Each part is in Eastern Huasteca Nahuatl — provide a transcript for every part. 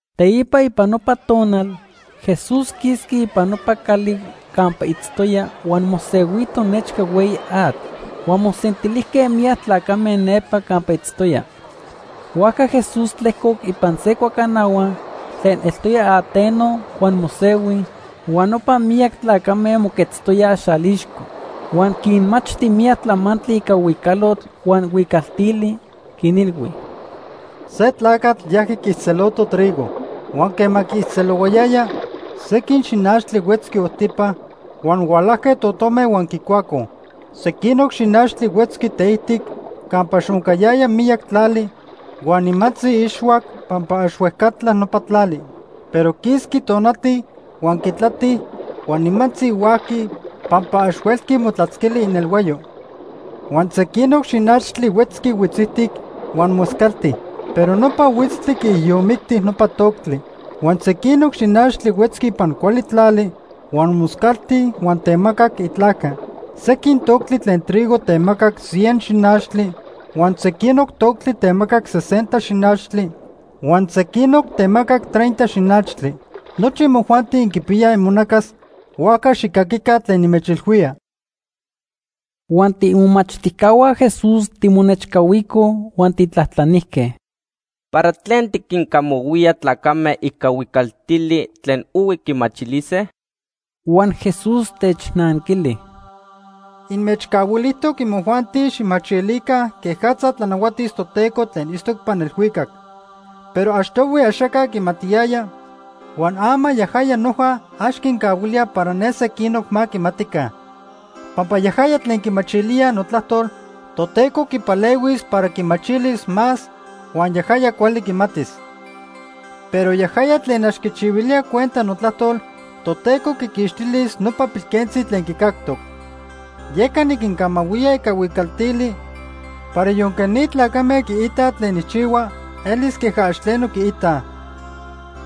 Teipa ipan nopa tonal, Jesús quisqui ipan nopa cali campa itztoya huan mosehuito nechca hueyi atl. Huan mosentilijque miyac tlacame nepa campa itztoya. Huajca Jesús tlejcoc ipan se cuacanahua tlen eltoya ateno huan mosehui, huan nopa miyac tlacame moquetztoyaj xalixco. Huan quinmachti miyac tlamantli ica huicalotl huan huicaltili, quinilhui: “Se tlacatl yajqui quiijtzeloto trigo. Huan quema quiijtzelohuayaya, sequin xinachtli huetzqui ojtipa huan hualajque totome huan quicuacoj. Sequinoc xinachtli huetzqui teijtic campa ax oncayaya miyac tlali huan nimantzi ixhuac pampa ax huejcatla nopa tlali. Pero quisqui tonati, huan quitlati, huan nimantzi huajqui pampa ax huelqui motlatzquili inelhuayo. Huan sequinoc xinachtli huetzqui huitzijtic huan moscalti, pero nopa huitztli quiijiyomicti nopa toctli. Huan sequinoc xinachtli huetzqui ipan cuali tlali huan moscalti huan temacac itlajca. Sequin toctli tlen trigo temacac cien xinachtli huan sequinoc toctli temacac sesenta xinachtli, huan sequinoc temacac treinta xinachtli. Nochi imojuanti inquipiyaj imonacas, huajca xijcaquica tlen nimechilhuía.” Huan tiimomachtijcahua Jesús timonechcahuicoj huan tijtlajtlanijque: “¿Para tlen tiquincamahuía tlacame ica huicaltili tlen ohui quimachilise?” Huan Jesús technanquili: “Inmechcahuilijtoc imojuanti xijmachilica quejatza tlanahuatis Toteco tlen itztoc ipan elhuicac. Pero achtohui axaca quimatiyaya, huan ama yajaya noja ax quincahuilía para ne sequinoc ma quimatica. Pampa yajaya tlen quimachilía notlajtol, Toteco quipalehuis para quimachilis más huan yajaya cuali quimatis. Pero yajaya tlen ax quichihuilía cuenta notlajtol, Toteco quiquixtilis nopa pilquentzi tlen quicactoc. Yeca niquincamahuía ica huicaltili para yonque ni tlacame quiitaj tlen nijchihua, elis queja ax tleno quiitaj.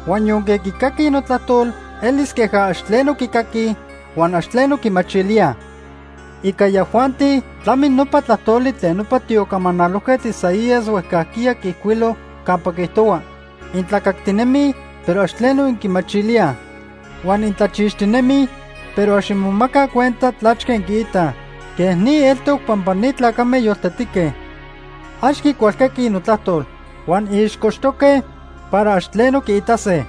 Huan yonque quicaquij notlajtol, elis queja ax tleno quicaquij huan ax tleno quimachilíaj. Ica yajuanti tlami nopa tlajtoli tlen nopa tiocamanalojquetl Isaías huejcajquiya quiijcuilo, campa quiijtohua: ‘Intlacactinemij, pero ax tleno inquimachilíaj. Huan intlachixtinemij, pero ax inmomacaj cuenta tlachque inquiitaj. Quej ni eltoc pampa ni tlacame yoltetique. Ax quicualcaquij notlajtol. Huan ixcochtoque para ax tleno quiitase.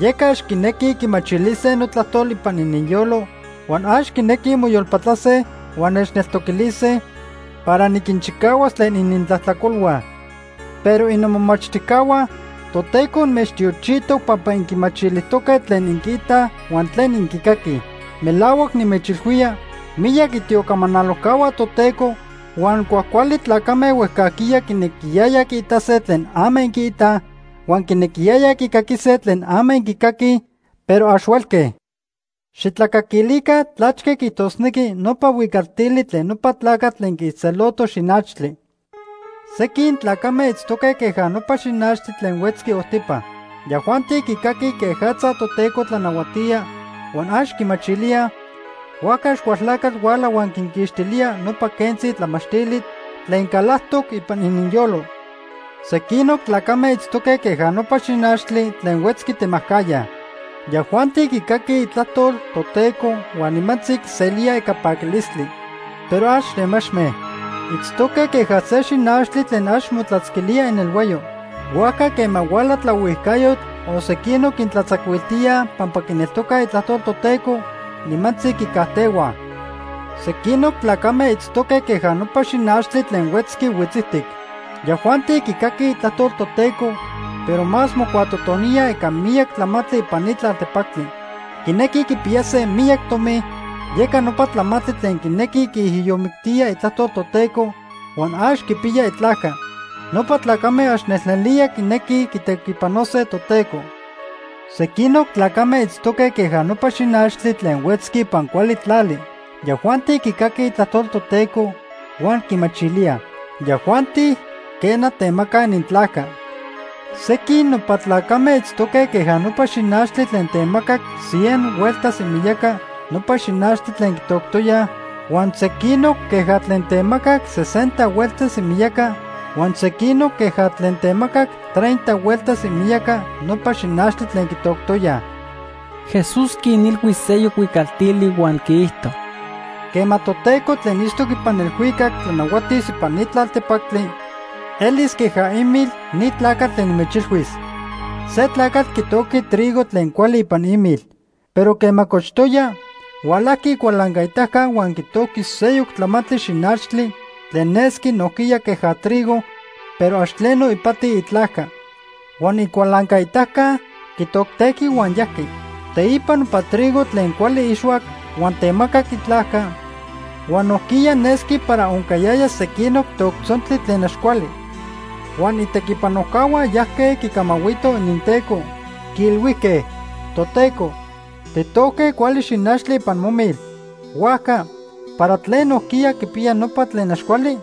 Yeca ax quinequij quimachilise notlajtol ipan ininyolo, huan ax quinequij moyolpatlase huan nechneltoquilise, para niquinchicahuas tlen inintlajtlacolhua.’ “Pero innomomachtijcahua, Toteco inmechtiochijtoc pampa inquimachilijtoque tlen inquiitaj huan tlen inquicaquij. Melahuac nimechilhuía, miyac itiocamanalojcahua Toteco huan cuajcuali tlacame huejcajquiya quinequiyayaj quiitase tlen ama inquiitaj, huan quinequiyayaj quicaquise tlen ama inquicaquij, pero ax huelque. “Xijtlacaquilica tlachque quiijtosnequi nopa huicaltili tlen nopa tlacatl tlen quiijtzeloto xinachtli. Sequin tlacame itztoque queja nopa xinachtli tlen huetzqui ojtipa. Yajuanti quicaquij quejatza Toteco tlanahuatía huan ax quimachilíaj, huajca Axcualtlacatl huala huan quinquixtilía nopa quentzi tlamachtili tlen calajtoc ipan ininyolo. Sequinoc tlacame itztoque queja nopa xinachtli tlen huetzqui temajcajya. Yajuanti quicaquij itlajtol Toteco huan nimantzi quiselíaj ica paquilistli. Pero ax temachme. Itztoque queja se xinachtli tlen ax motlatzquilía inelhuayo. Huajca quema huala tlaohuijcayotl o sequinoc quintlatzacuiltíaj pampa quineltocaj itlajtol Toteco, nimantzi quicajtehuaj. Sequinoc tlacame itztoque queja nopa xinachtli tlen huetzqui huitzijtic. Yajuanti quicaquij itlajtol Toteco, pero más mocuatotoníaj ica miyac tlamantli ipan ni tlaltepactli. Quinequij quipiyase miyac tomi, yeca nopa tlamantli tlen quinequij quiijiyomictíaj itlajtol Toteco huan ax quipiyaj itlajca. Nopa tlacame ax nelnelía quinequij quitequipanose Toteco. Sequinoc tlacame itztoque queja nopa xinachtli tlen huetzqui ipan cuali tlali. Yajuanti quicaquij itlajtol Toteco huan quimachilíaj. Yajuanti, quena, temacaj inintlajca. Sequin nopa tlacame itztoque queja nopa xinachtli tlen temacac cien hueltas imiyaca nopa xinachtli tlen quitoctoyaj, huan sequinoc queja tlen temacac sesenta hueltas imiyaca, huan sequinoc queja tlen temacac treinta hueltas imiyaca nopa xinachtli tlen quitoctoyaj.” Jesús quinilhui seyoc huicaltili huan quiijto: “Quema Toteco tlen itztoc ipan elhuicac tlanahuatis ipan ni tlaltepactli, elis queja imil ni tlacatl tlen nimechilhuis. Se tlacatl quitojqui trigo tlen cuali ipan imil. Pero quema cochtoya, hualajqui icualancaitaca huan quitojqui seyoc tlamantli xinachtli tlen nesqui nojquiya queja trigo, pero ax tleno ipati itlajca. Huan icualancaitaca quitoctejqui huan yajqui. Teipa nopa trigo tlen cuali ixhuac huan temacac itlajca, huan nojquiya nesqui para oncayaya sequinoc toctzontli tlen ax cuali. Huan itequipanojcahua yajque quicamahuitoj ininteco, quiilhuijque: ‘Toteco, tijtojque cuali xinachtli ipan momil. Huajca ¿para tlen nojquiya quipiya nopa tlen ax cuali?’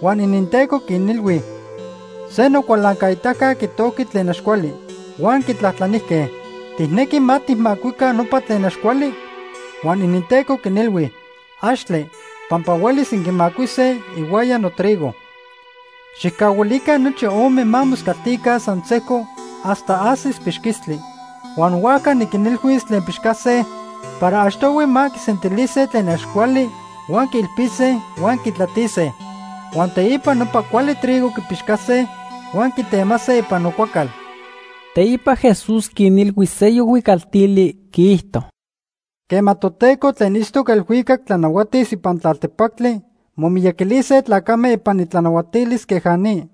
“Huan ininteco quinilhui: ‘Se nocualancaitaca quitojqui tlen ax cuali.’ “Huan quitlajtlanijque: ‘¿Tijnequi ma tijmacuica nopa tlen ax cuali?’ “Huan ininteco quinilhui: ‘Axtle, pampa huelis inquimacuise ihuaya notrigo. Xijcahuilica nochi ome ma moscaltica san sejco hasta ajsis pixquistli. Huan huajca niquinilhuis tlen pixcase para achtohui ma quisentilise tlen ax cuali huan quiilpise huan quitlatise. Huan teipa nopa cuali trigo quipixcase huan quitemase ipan nocuacal.’” Teipa Jesús quinilhui seyoc huicaltili, quiijto: “Quema Toteco tlen itztoc elhuicac tlanahuatis ipan tlaltepactli momiyaquilise tlacame ipan itlanahuatilis queja ni.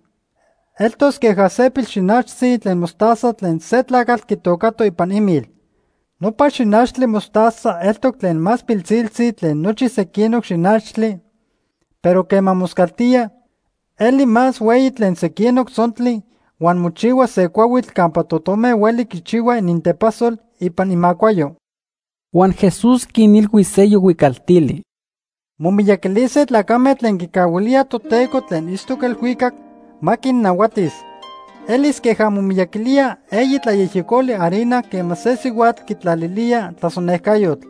Eltos queja se pilxinachtzi tlen mostaza tlen se tlacatl quitocato ipan imil. Nopa xinachtli mostaza eltoc tlen más pilsiltzi tlen nochi sequinoc xinachtli, pero quema moscaltía, eli más hueyi tlen sequinoc tzontli huan mochihua se cuahuitl campa totome hueli quichihuaj inintepasol ipan imacuayo.” Huan Jesús quinilhui seyoc huicaltili: “Momiyaquilise tlacame tlen quicahuilíaj Toteco tlen itztoc elhuicac ma quinnahuatis. Elis queja momiyaquilía eyi tlayejyecoli harina quema se sihuatl quitlalilía tlasonejcayotl.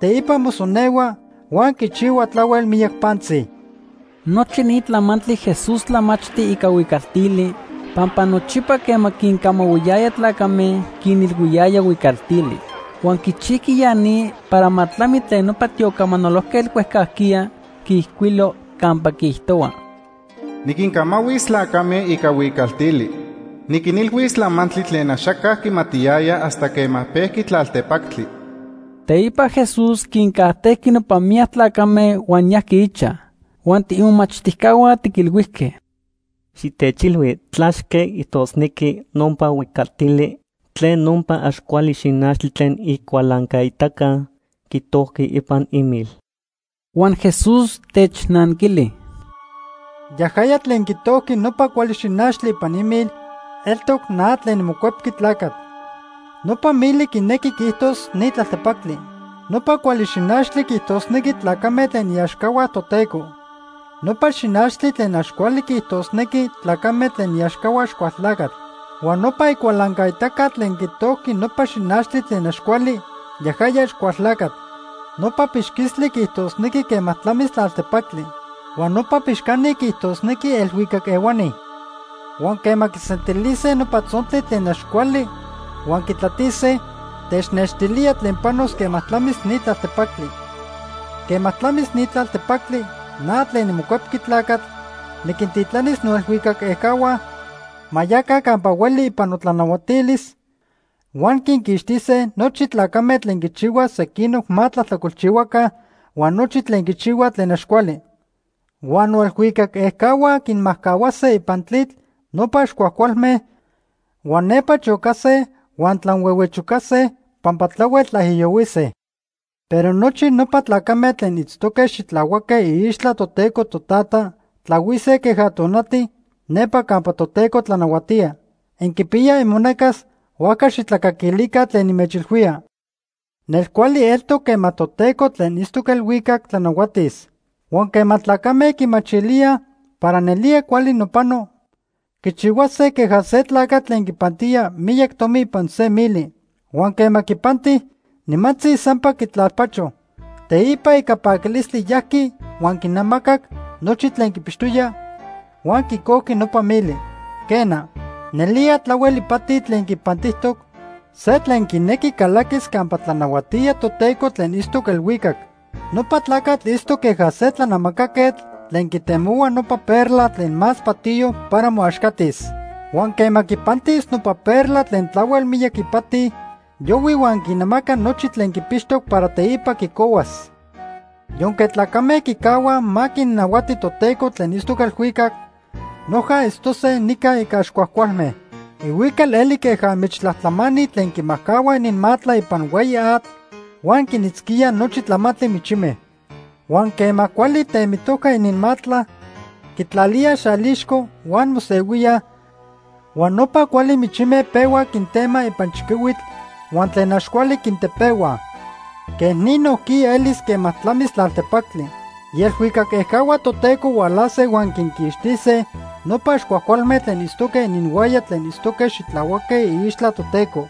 Teipa mosonehua huan quichihua tlahuel miyac pantzi.” Nochi ni tlamantli Jesús tlamachti ica huicaltili, pampa nochipa quema quincamahuiyaya tlacame, quinilhuiyaya huicaltili. Huan quichijqui ya ni para ma tlami tlen nopa tiocamanalojquetl huejcajquiya quiijcuilo campa quiijtohua: “Niquincamahuis tlacame ica huicaltili. Niquinilhuis tlamantli tlen axaca quimatiyaya hasta quema pejqui tlaltepactli.” Teipa Jesús quincajtejqui nopa miyac tlacame huan yajqui ichaj, huan tiimomachtijcahua tiquilhuijque: “Xitechilhui tlachque quiijtosnequi nopa huicaltili tlen nopa ax cuali xinachtli tlen icualancaitaca quitojqui ipan imil.” Huan Jesús technanquili: “Yajaya tlen quitojqui nopa cuali xinachtli ipan imil, eltoc na tlen niMocuepqui Tlacatl. Nopa mili quinequi quiijtos ni tlaltepactli. Nopa cuali xinachtli quiijtosnequi tlacame tlen iaxcahua Toteco. Nopa xinachtli tlen ax cuali quiijtosnequi tlacame tlen iaxcahua Axcualtlacatl. Huan nopa icualancaitaca tlen quitojqui nopa xinachtli tlen ax cuali, yajaya Axcualtlacatl. Nopa pixquistli quiijtosnequi quema tlamis tlaltepactli. Huan nopa pixcani quiijtosnequi elhuicac ehuani. Huan quema quisentilise nopa tzontli tlen ax cuali huan quitlatise, technextilía tlen panos quema tlamis ni tlaltepactli. Quema tlamis ni tlaltepactli, na tlen niMocuepqui Tlacatl niquintitlanis noelhuicac ejcahua ma yaca campa hueli ipan notlanahuatilis, huan quinquixtise nochi tlacame tlen quichihuaj sequinoc ma tlajtlacolchihuaca huan nochi tlen quichihuaj tlen ax cuali. Huan noelhuicac ejcahua quinmajcahuase ipan tlitl nopa ax cuajcualme huan nepa chocase huan tlanhuehuechocase pampa tlahuel tlaijiyohuise. Pero nochi nopa tlacame tlen itztoque xitlahuaque iixtla Toteco Totata tlahuise queja tonati nepa campa Toteco tlanahuatía. Inquipiyaj imonacas, huajca xijtlacaquilica tlen nimechilhuía. “Nelcuali eltoc quema Toteco tlen itztoc elhuicac tlanahuatis. Huan quema tlacame quimachilíaj para nelía cuali nopano, quichihuase queja se tlacatl tlen quipantía miyac tomi ipan se mili. Huan quema quipanti, nimantzi sampa quitlalpacho. Teipa ica paquilistli yajqui huan quinamacac nochi tlen quipixtoya huan quicojqui nopa mili. “Quena, nelía tlahuel ipati tlen quipantijtoc se tlen quinequi calaquis campa tlanahuatía Toteco tlen itztoc elhuicac. Nopa tlacatl itztoc queja se tlanamacaquetl tlen quitemohua nopa perla tlen más patiyo para moaxcatis. Huan quema quipantis nopa perla tlen tlahuel miyac ipati, yohui huan quinamaca nochi tlen quipixtoc para teipa quicohuas. “Yonque tlacame quicahuaj ma quinnahuati Toteco tlen itztoc elhuicac, noja itztose nica ica ax cuajcualme. Ihuical eli queja michtlajtlamani tlen quimajcahuaj ininmatla ipan hueyi atl, huan quinitzquíaj nochi tlamantli michime. Huan quema cuali temitojca ininmatla, quitlalíaj xalixco huan mosehuíaj huan nopa cuali michime pehuaj quintemaj ipan chiquihuitl huan tlen ax cuali quintepehuaj. Quej ni nojquiya elis quema tlamis tlaltepactli. Ielhuicac ejcahua Toteco hualase huan quinquixtise nopa ax cuajcualme tlen itztoque ininhuaya tlen itztoque xitlahuaque iixtla Toteco.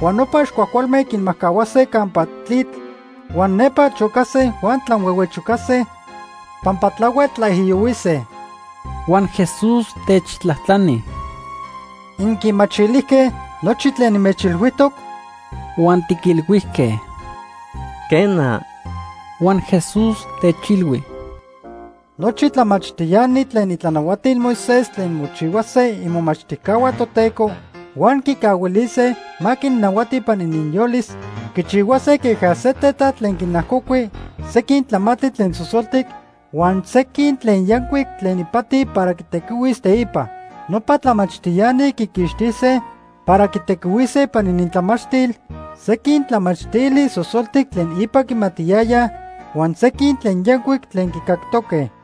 Huan nopa ax cuajcualme quinmajcahuase campa tlitl huan nepa chocase huan tlanhuehuechocase pampa tlahuel tlaijiyohuise.” Huan Jesús techtlajtlani: ―¿Inquimachilijque nochi tlen nimechilhuijtoc? Huan tiquilhuijque: ―Quena. Huan Jesús techilhui: ―Nochi tlamachtiani tlen itlanahuatil Moisés tlen mochihuase imomachtijcahua Toteco huan quicahuilise ma quinnahuati ipan ininyolis quichihuase queja se tetat tlen quinajcocui sequin tlamantli tlen sosoltic huan sequin tlen yancuic tlen ipati para quitequihuis teipa. Nopa tlamachtiani quiquixtise para quitequihuise ipan inintlamachtil sequin tlamachtili sosoltic tlen ipa quimatiyayaj huan sequin tlen yancuic tlen quicactoque.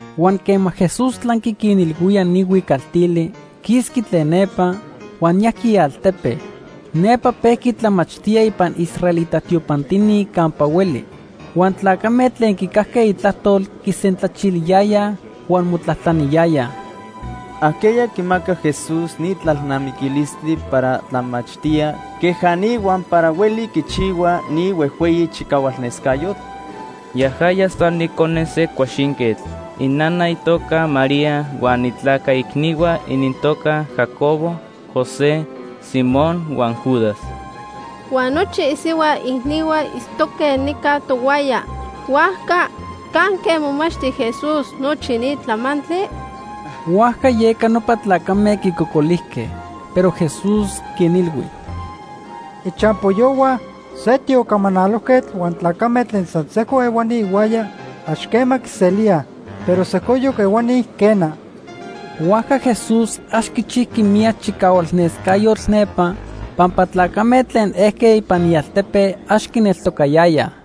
Huan quema Jesús tlanqui quinilhuía ni huicaltili, quisqui tlen nepa, huan yajqui ialtepe. Nepa pejqui tlamachtía ipan israelita tiopantini campa hueli. Huan tlacame tlen quicajque itlajtol quisentlachiliyayaj huan motlajtlaniyayaj: ―¿Ajqueya quimaca Jesús ni tlalnamiquilistli para tlamachtía queja ni huan para hueli quichihua ni huejhueyi chicahualnescayotl? Yajaya san icone se cuaxinquetl. Inana itoca María huan itlaca icnihua inintoca Jacobo, José, Simón huan Judas. Huan nochi isihua icnihua itztoque nica tohuaya. Huajca ¿canque momachti Jesús nochi ni tlamantli? Huajca yeca nopa tlacame quicocolijque. Pero Jesús quinilhui: ―Ichampoyohua se tiocamanalojquetl huan tlacame tlen san sejco ehuani ihuaya, ax quema quiselíaj, pero sejcoyoc ehuani, quena. Huajca Jesús ax quichijqui miyac chicahualnescayotl nepa pampa tlacame tlen ejque ipan ialtepe ax quineltocayayaj.